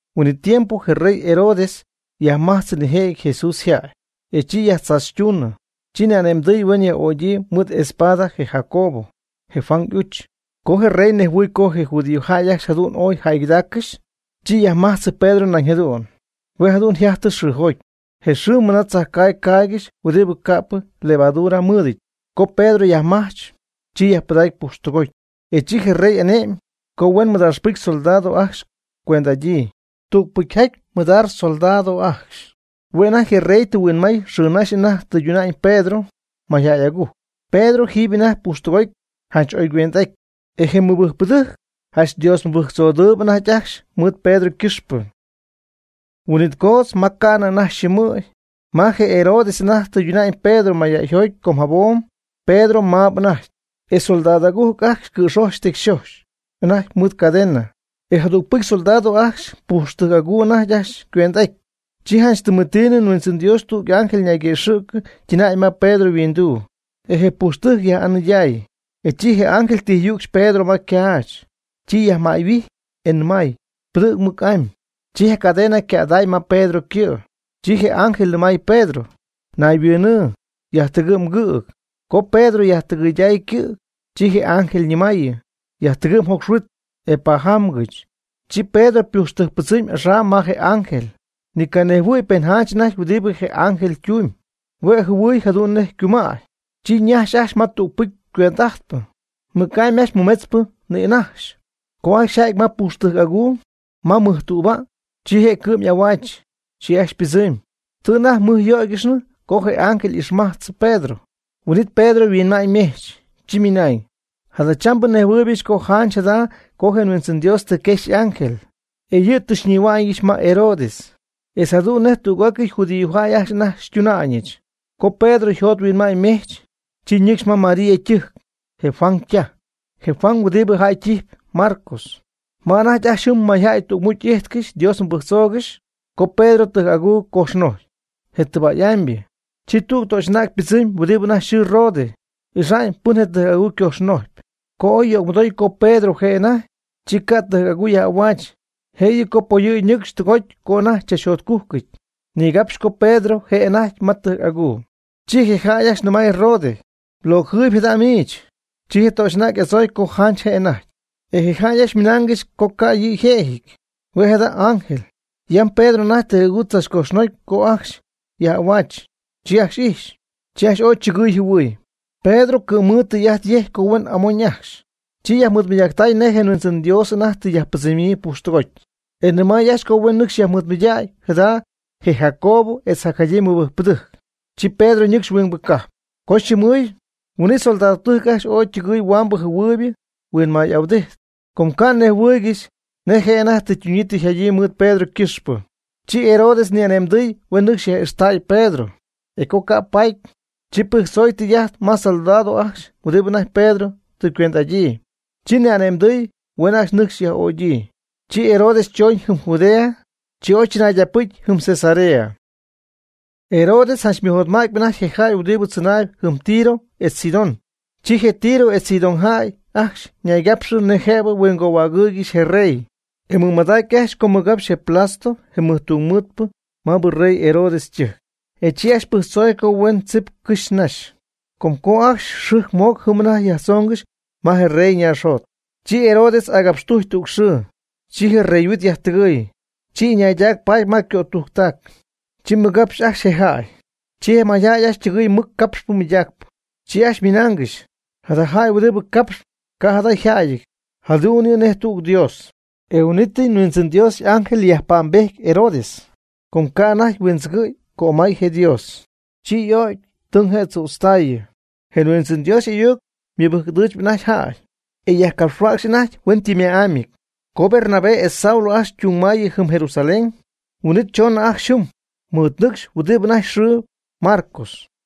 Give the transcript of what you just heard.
Huin'it tiempo je rey Herodes yajmajtzɨ nijëjɨty Jesús yjäy, e chi yajtzaachytuunɨ. Chi ni'ane'mdɨy huen yaj'ögyii mɨɨd espada je Jacobo, je Juan y'uch. Co je rey nejhuɨɨy co je judíojäy ajcxy jadu'n ooy jäygɨdaaccɨxy, chi ymajtzɨ Pedro nañ jadu'n. Hue' jadu'n yjajtɨ xɨɨjoty, je xɨɨ mɨna tzajcaagy caaygɨxy huɨdi ca'pɨ ylevadura mɨɨdɨty. Co Pedro yajmajch, chi yajpɨdacy pujxtɨgoty. E chi je rey ane'my co huen mɨdaaxpɨcy soldado ajcxy cuend'adyii, tügpɨcyjaty mɨdaax soldado ajcxy. Hue' anajty je rey tɨ huinmay xɨɨnaxy anajty tɨyduna'ñ Pedro mayjäy agujc. Pedro jiiby anajty pujxtɨgoty janch oy cuend'aty. E je mɨbɨjcpɨdɨjc janch Dios mɨbɨjctzodɨɨb anajty ajcxy mɨɨd Pedro ycɨxpɨ. Huin'it coodz ma ca'nɨ anajty yxɨɨmɨ̈y, ma je Herodes anajty tɨyduna'ñ Pedro mayjäyjoty com jabom, Pedro maab anajty, e soldado agujc ajcxy cɨ̈xoch tecyxoch anajty mɨɨd cadena, e jadügpɨcy soldado ajcxy pujxtɨjc'aguy anajty ajcxy ycuend'aty. Chi janch tɨmetiinɨ yHuindzɨn Dios tüg y'ángel ñayguëxɨ̈cɨ ytɨnäy ma Pedro yhuinduu, e je pujxtɨjc yaj'anɨyday. E chi je ángel tijyücxy Pedro ma ycaach, chi yajmäyhuijy, e nɨmay: ―Pɨdɨ̈g mɨc'amy. Chi je cadena ycäday ma Pedro ycɨ'. Chi je ángel nɨmay Pedro: ―Ñayhuɨɨnɨ, yajtɨgɨ' mgɨ̈g. Co Pedro yajtɨgɨyday ycɨ̈g, chi je ángel ñɨmaayɨ: ―Yajtɨgɨ' mjocxhuit, e pajamgɨch. Chi Pedro pujxtɨjc pɨdzɨmy axam ma je ángel, ni ca' nejhuɨ̈y pen janch anajty huɨdibɨ je ángel tumyb, hue' jɨhuɨy jadu'n nej ycumäy. Chi ñajxy ajcxy ma tügpɨcy cuend'ajtpɨ, mɨc'amy ajcxy mɨmetzpɨ nïnajxy. Co ajcxy yjäty ma mɨjpujxtɨjc aguu, ma mɨjtüba', chi je' cɨ'm'ahuaach. Chi ajcxy ypɨdzɨmy. Tɨ anajty mɨjyöygɨxnɨ co je ángel ixmajtznɨ Pedro. Huin'it Pedro yhuinma'ñymejch, chi ymɨnañ: ―Jadachambɨ njɨhuɨɨybɨch co janch jada' co je Huindzɨn Dios tɨ quexy y'ángel, e yɨ' tɨ xyñihua'ñɨch ma Herodes, etz jadu'n nej tüg'ócɨy judíojäy ajcxy anajty xytuna'ñɨch. Co Pedro yjot yhuinma'ñ ymejch, chi ñɨcxy ma María ytɨjc, je Juan ytaj, je Juan huɨdi jäy ytijpy Marcos, ma anajty ajcxy jɨm mayjäy tügmucy y'íjtcɨxy Dios mɨbɨjctzoogɨxy. Co Pedro tɨjc'aguu cojxnojcy, je tɨba'y'amybɨ, chi tüg töxy'anäg ypɨdzɨmy huɨdi anajty yxɨɨ Rode, ixa'ñ pɨn je' tɨjc'aguu cojxnojcy. Co oy yögmɨdoy co Pedro je' anajty, chi ca' ytɨjc'aguu yaj'ahuaach. Jëyɨ co poyɨ̈gy ñɨcxy tɨgoty co anajty tzachjotcújcɨty, nigapxy co Pedro je' anajty ma tɨjc'aguu. Chi je jäy ajcxy nɨmay Roda: ―Mloocjɨɨyb jada' miich. Chi je töxy'anäg y'adzooy co janch je' anajty. E je jäy ajcxy ymɨnaangɨxy co ca' yɨ' yjëjɨty, hue' jada' Pedro y'ángel. Yam Pedro anajty tɨjc'aguu tzachcojxnocy co ajcxy yaj'ahuaach, chi ajcxy ijxy, chi ajcxy ooy chɨgɨɨy yjɨhuɨɨy. Pedro cɨ̈mɨɨd ytɨy'ajtyejcy co huen amoñ ajcxy. Chi yajmɨɨdmɨydacy nej je Huindzɨn Dios anajty tɨ yajpɨdzɨmyii pujxtɨgoty. E nɨmay ajcxy co huen nɨcxy yajmɨɨdmɨydägy jada je Jacobo etz jacjadyii mɨbɨjcpɨdɨjc. Chi Pedro ñɨcxy huingbɨ cajp. Co yxɨɨmɨɨy, huin'it soldadtɨjc ajcxy ooy ytɨgɨɨy huambɨ jɨhuɨɨybɨ huinmay'ahuɨdijty, com ca' nejhuɨɨygɨxy nej je' anajty tɨ ytunyii tɨ yjadyii mɨɨd Pedro ycɨxpɨ. Chi Herodes ni'ane'mdɨɨy huen nɨcxy yaj'ixtäy Pedro. E co ca' yajpaty, chi pɨjctzoy tɨy'ajt ma soldado ajcxy huɨdi anajty Pedro tɨ ycuend'adyii. Chi ni'ane'mdɨy huen ajcxy nɨcxy yaj'ögyii. Chi Herodes chooñ jɨm Judea, chi oy chɨnaydacpɨcy jɨm Cesarea. Herodes janch ymɨjotmätpy anajty je jäy huɨdibɨ tzɨnaayb jɨm Tiro etz Sidón. Chi je Tiro etz Sidón jäy ajcxy ñaygapxɨ nej jëbɨ huingohuägɨ̈huaangɨxy je rey. E ymɨmadac ajcxy co mɨgapxy je Blasto je mɨjtungmɨɨdpɨ maabɨ rey Herodes ytɨjc. E chi ajcxy pɨjctzoy co huen tzip cɨxy naxy, com co ajcxy xɨjc mooc jɨm anajty yajtzoongɨxy ma rey ñaaxjot. Chi Herodes agapxtujcy tüg xɨɨ, chi je reyhuit yajtɨgɨɨy, chi ɨñaydac paty ma ycötujctac, chi mɨgapxy ajcxy je jäy. Chi je mayjäy ajcxy ytɨgɨɨy mɨc capxp mɨydaacp, chi ajcxy ymɨnaangɨxy: ―¡Jada jäy huɨdibɨ capxp, ca' jada yjäyɨty, jadu'n yɨ' nej tüg dios! E huin'ítɨy Huindzɨn Dios y'ángel yajpa'mbejty Herodes, com ca' anajty huindzɨgɨ̈y cömay je Dios. Chi y'o'cy, tɨng je' tzütztaayɨ. Je Huindzɨn Dios y'ayuc mɨbɨjc'ɨdɨ̈chpy anajty jäy, e yajcapxhuäcxp anajty hueñytɨmma'ámyɨty. Co Bernabé etz Saulo ajcxy ytungmay jɨm Jerusalén, huin'it choonɨ ajcxy jɨm ymɨɨdnɨcxy huɨdibɨ anajty yxɨɨ Marcos.